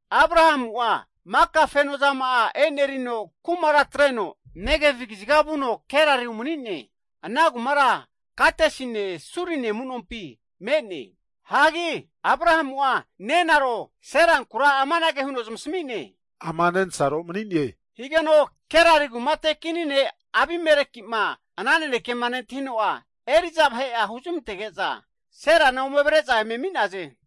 Abrahamu'a maka feno ma'ane kumara atreno, Negev kaziga Gerar umani'ne. Ana kumara Kadesine, Surine amunompi me'ne. Abrahamu'a nenaro Seranku amanage huno zamasmi'ne, ama nensaro mani'ne. Abimeleki Gerari kumate kini ne'mo ana naneke nentahino, eri'za vahe'a huzmantege'za Serana ome avre'za Abimeleki eme ami'naze.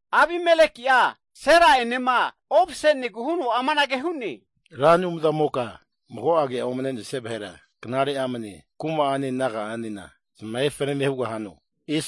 Abimeleki'a Sera'enema ovase'negu huno amanage hu'ne. Ramoka mago ke'a omne'nesia vahera knare amne kuma'ane naga'anena zamahe fanane hugahano?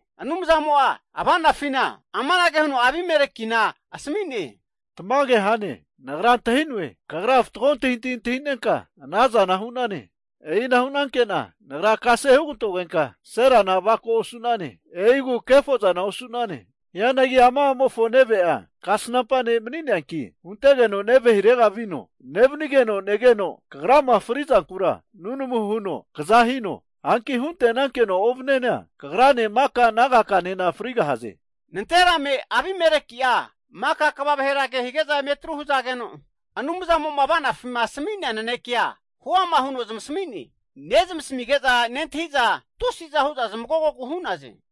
Anumzamo ava'nafi amanage huno asmi'ne, tamage, Nagra antahi'noe, kagra fatgo antahintahi antahinenka, anazana hu'nane. E'ina hu'nanke'na Nagra kase hugantogenka Serana avako osu'nane. E'igu kefozana osu'nane. Hianagi ama a'mofo neve'a kasnampa (profet) ne' mani'neanki, huntegeno neve hirega vino. Nevnigeno negeno, kagrama fri'zankura nunamu huno kza hino. Hanki hunte'nankeno ovniana, kagrane maka'a naga kanena frigahaze. Nanterame Abimeleki'a maka'a kva vahera ke hige'za eme atru hzageno, Anumzamo'ma ava'nafi asmi'nea nanekea huama huno zamasmi'ne. Nezmasmige'za nentahi'za, tusi'za hu'za zamagogogu hu'naze.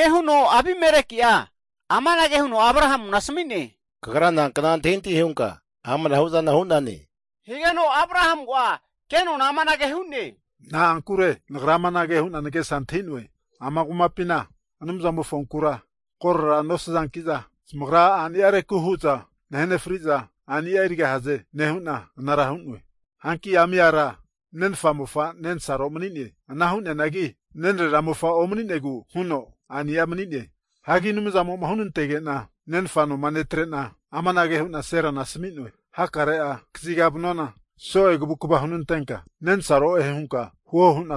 Abimeleki'a amanage huno Abrahamu asmi'ne. Kagra na agafare amanahu'zana hane? Abrahamu amanage hu'ne, Na'ankure nagra amanage huna nagesa antahi'noe, ama kumapina Anumzamofonku koro nosazankiza, zamagra a'niareku hu'za nahegahaze. Hanki ami ara nensaro mani'ne, nenfa mofa, ana hu'neanagi nenrera mofa omninegu huno a'ni'a mani'ne. Hanki Anumzamo'ma hunatege'na nenfa noma netre'na amanage hu'na Seranku asmi'noe, amai soe kvukva hunantegahane, hakare'a kaziga vanuana, nagriku'ma hanunka nenfu'e hunka huo.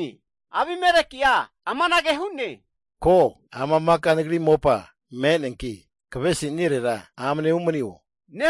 Abimeleki'a amanage hu'ne, ko, ama nagri mopa me'ne, kvesinirera amne umanio.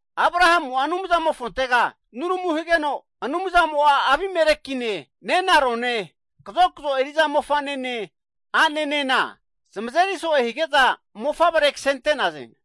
Anumzamofonte nunmu higeno Anumzamo Abimelekine, nenarone, kazokzo eri'za mofane ane zamazeri soe higeza mofavre ksente'naze.